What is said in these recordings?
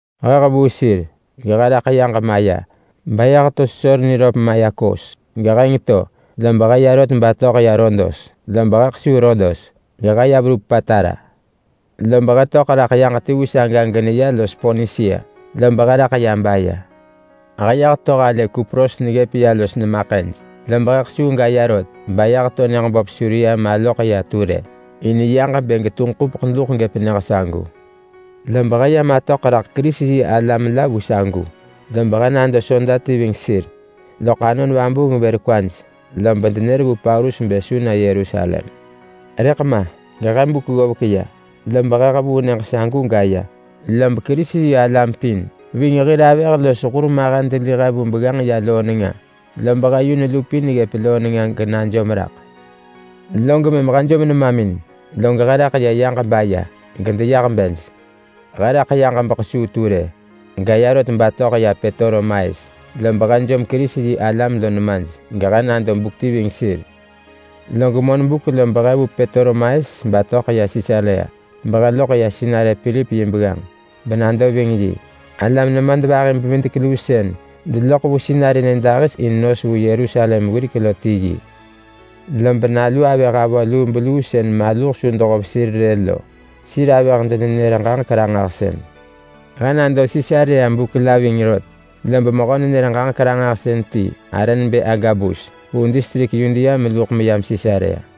He hevuu sir gehe raḳ ya yaġ maya, baya heto sesor niröp maya Kos. Geheng to lob he ya rot batöḳ ya Rodos. Lob he kesuu Rodos gehe ya verup Patara. Lob he töḳ raḳ yaġ ti vu saga geneya los Ponisia. Lob he raḳ ya baya. He ya heto halë Kupros neggëp ya los he nemamin ḳëj, lob he kesuu gaya rot baya neto nyëġ böp Suria maloḳ ya Ture. In yaġ bë getunġ ḳupeḳ duḳ gëp nyëġ sagu. Lob he ya matöḳ raḳ Kerisi-yi-alam la vu sagu, lob he nado soda ti ving sir. Loḳ Anon Vabuung vër kwaj lob denër vu Paulus bë su na Yerusalem. Rëḳ ma gehe buk ggovek ya, lob he hevuu nyëġ sagu gaya, lob Kerisi-yi-alam pin ving hir avëh los hur mahen deli he vu begganġ ya loo nenga. Lob he yun lupin ggëp loo nenga genajom raḳ. Log mëm he jom nemamin, log he raḳ ya yaġ baya gedeyah bej. He raḳ yaġ bekesuu Ture gaya rot batöḳ ya Petolemais. Lob he jom Kerisi-yi-alam lo nemaj gehe nado buk ti ving sir. Lob monbuk lob he vu Petolemais batöḳ ya Sisarea, behe loḳ ya sinarë Pilip yi begganġ benado ving yi. Alam nemadvahi-bevidek-luu sën deloḳ vu sinarë nyëdahis in nos vu Yerusalem wirek lo ti yi. Lob nalu avëh avö lubeluu sën maluh su dehov sir rë lo, lob sir avëh-denenër-ġaġek-ranġahsën. He nado Sisarea buk la ving rot, lob mehö-nenër-ġaġek-ranġahsën ti arë nebë Agabus vu distrik Yudea meluḳ meyam Sisarea.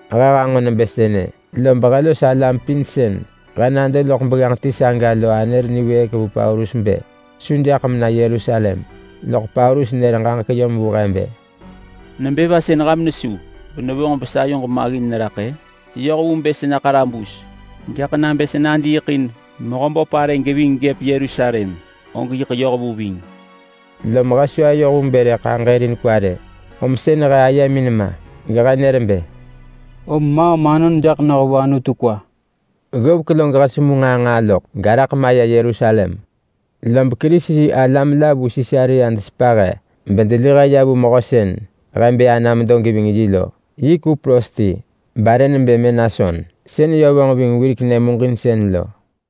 He hanġo nebë sënë, lob he los alam pin sën he nado loḳ begganġ ti saga lo anër niwëëk vu Paulus bë su jaḳ mena Yerusalem. Loḳ Paulus nër ġaġek yom vu he bë, “Nebë va sën ham nesu benevonġ mesayoġ maggin neraḳ-ë? Seyoh vu bë sena ḳarabus. Gaḳ nabë sa nadiiḳ in Mehöböp arë geving gëp Yerusalem, og yiḳ yoh vu ving!” Lom he su ayoh vu bë rëḳ aġërin kwa rë, om sën he ayemin ma, gehe nër bë, “Om maam anon jaḳ noh vu Anutu kwa!” Ggovek log he semu nġaa nġaa loḳ, garaḳ maya Yerusalem. Lob Kerisi-yi-alam la vu Sisarea desepa he bedeli he ya vu mehö sën he bë ana medo geving yi lo. Yi Kupros ti barë nebë Menason, sën yö vonġ ving wirek nyëmuġinsën lo.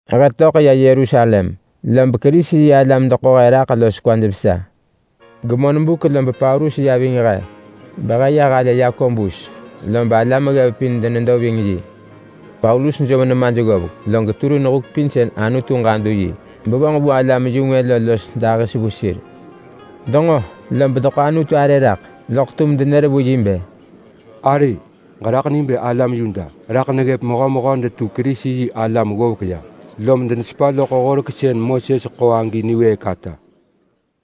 He töḳ ya Yerusalem, lob Kerisi-yi-alam deḳo he raḳ los kwaj vesa. Gemonbuk lob Paulus ya ving he, behe ya halë Yakobus. Lob alam ggev pin denedo ving yi. Paulus jom nemaj ggovek, log turin huk pin sën Anutu ġadu yi bevonġ vu alam-yu-ngwë lo los dahis vu sir. Denġo lob deḳo Anutu arë raḳ, loḳ tum denër vu yi bë, “Ari! Ġeraḳ ni bë alam Yuda raḳ neggëp mehömehö detu Kerisi-yi-alam ggovek ya, lom denesepa loḳ horek sën Moses ḳo agi niwëëk ata.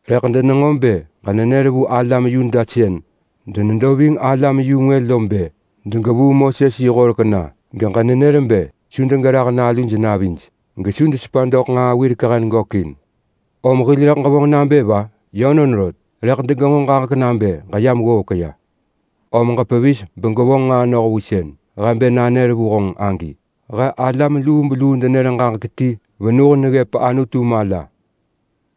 Rëḳ denenġo bë ġenenër vu alam Yuda sën denedo ving alam-yu-ngwë lo bë degevuu Moses yi horek na, geġenenër bë su degerah naluj navij, gesu desepa doḳ nġaa wirek hen gökin. Om hil rëḳ ġevonġ nabë va? Yönon rot, rëḳ degenġo ġaġek nabë ġeyam ggovek ya. Om ġepevis begwevonġ nġaa noh vu sën he bë nanër vu honġ agi. He alam lubeluu denër ġaġek ti venuh neggëp Anutu mala.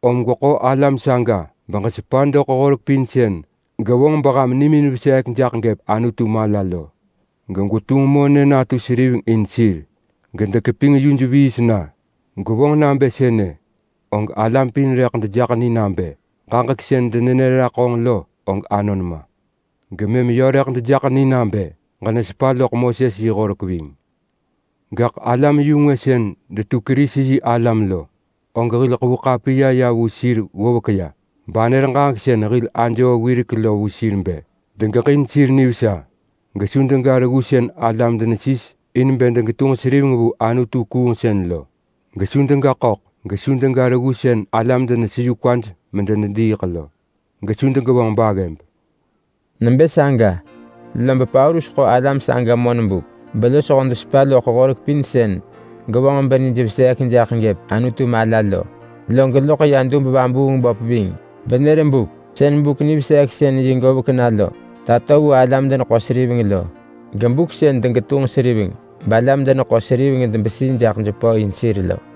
Om gweḳo alam saga, beġesepa doḳ horek pin sën gevonġ beham nimin veseek jaḳ gëp Anutu mala lo, gegwetunġ monë natu seriveng in sir gedekeping yuj viis na. Gwevonġ nabë sënë, og alam pin rëḳ dejaḳ ni nabë ġaġek sën denenër raḳ honġ lo, og anon ma. Gemëm yö rëḳ dejaḳ ni nabë ġenesepa loḳ Moses yi horek ving. Gaḳ alam-yu-ngwë sën detu Kerisi-yi-alam lo, og hil ḳevu ḳapiya ya vu sir ggovek ya banër ġaġek sën hil ajoo wirek lo vu sir bë: Degeġin sir nivesa, gesu dega reggu sën alam denesis in bë degetunġ seriveng vu anutu-kuungsën lo, gesu dega ḳöḳ, gesu dega reggu sën alam deneseyu kwaj medenediiḳ lo, gesu degevonġ baggëb.” Nebë saga, lob Paulus ḳo alam saga monbuk belosho desepa loḳ horek pin sën gevonġ benij veseek jaḳ gëp Anutu mala lo. Log loḳ ya dub-vabuung-böp ving benër buk sën buk-niveseeksën-yi govek na lo tato vu alam-deneḳo-seriveng lo. Buk sën degetunġ seriveng balam-deneḳo-seriveng debesi jaḳ jepö vu sir lo.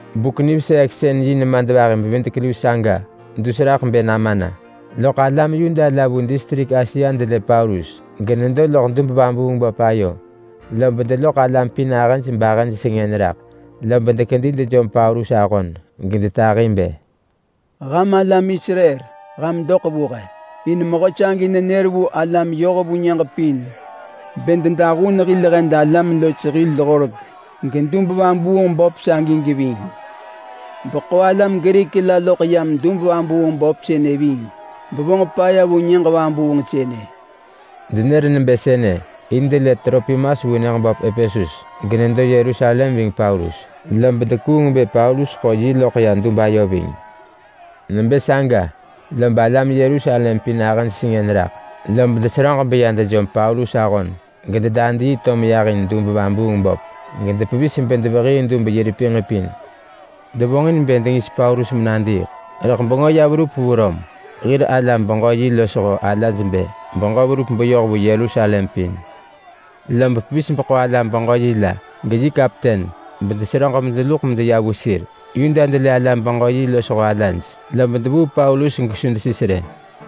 Buk-niveseeksën-yi nemadvahi-bevidek-luu saga dus raḳ bë nama na, loḳ alam Yuda la vu distrik Asia delë Paulus genedo loḳ dub-vabuung-böp ayo, lob deloḳ alam pin ahëj bahëj sengën raḳ. Lob dekedi dejom Paulus ahon gedetahi bë, “Ham alam Israel, ham doḳ vu he! In mehö sagi nenër vu alam yoh vu nyëġ pin bë dedahun hil hed alam los hil horek gedub-vabuung-böp sagi geving. Beḳo alam Grik la loḳ yam dub-vabuung-böp sënë ving bevonġ paya vu nyëġ vabuung sënë!” Denër nebë sënë in delë Tropimas vu nyëġ böp Epesus genedo Yerusalem ving Paulus, lob dekuung bë Paulus ḳo yi loḳ ya dub ayo ving. Nebë saga, lob alam Yerusalem pin ahëj sengën raḳ, lob deseröġ beya dejom Paulus ahon, gededadii to meyah in dub-vabuung-böp. Gedepevis bedevehii dub yi repinġ pin. Devonġin bë dengis Paulus menadiiḳ, rëḳ bengö ya verup vu Rom hir alam-beġö-yi losho alaj bë beġö verup beyoh vu Yerusalem pin. Lob pevis beḳo alam-beġö-yi la, geyi kapten, bedeseröġ medeluḳ medeya vu sir. Yuda delë alam-beġö-yi losho alaj, lob devuu Paulus gesu desis rë.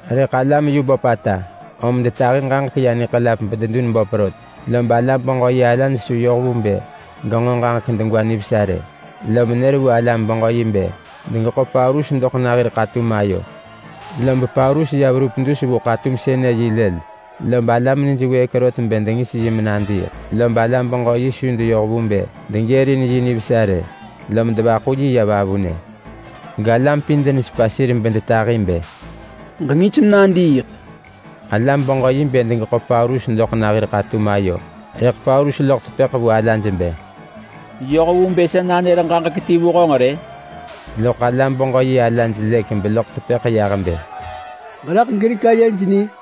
Rëḳ alam yu böpata, om detahi ġaġek ya niḳelap bededun böp rot. Lob alam-beġö-yi alaj su yoh vu bë genġo ġaġek degwa nivesa rë, lom nër vu alam-beġö-yi bë degeḳo Paulus doḳ na hir ḳatum ayo. Lob Paulus ya verup dus vu ḳatum sënë yi lël lob alam nij wëëk rot bë dengis yi menadiiḳ, lob alam-beġö-yi su deyoh vu bë degërin yi nivesa rë, lom devaḳu yi ya vavunë. Galam pin denesepa sir bedetahi bë, “Ġengis menadiiḳ!” Alam-beġö-yi bë degeḳo Paulus doḳ na hir ḳatum ayo, rëḳ Paulus loḳ tepëḳ vu alaj bë, “Yoh vu bë sa nanër ġaġek ti vu honġ rë?” Loḳ alam-beġö-yi alaj lëk beloḳ tepëḳ yah bë, “Ġeraḳ Grik ayej ni?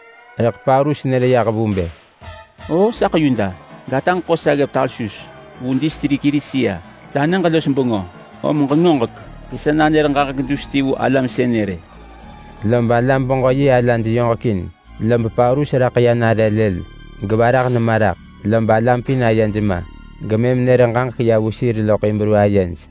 Rëḳ Paulus nër yah vu bë, “O saḳ Yuda, gataġ ḳo sa ggëp Tarsus vu distrik Kilisia. Sa nyëġ los bengö. Om ġengoġek gesa nanër ġaġek dus ti vu alam sënë rë.” Lob alam-beġö-yi alaj yoġekin. Lob Paulus raḳ ya nare lël gevarah nema raḳ. Lob alam pin ayej ma, gemëm nër ġaġek ya vu sir loḳ Hibru ayej.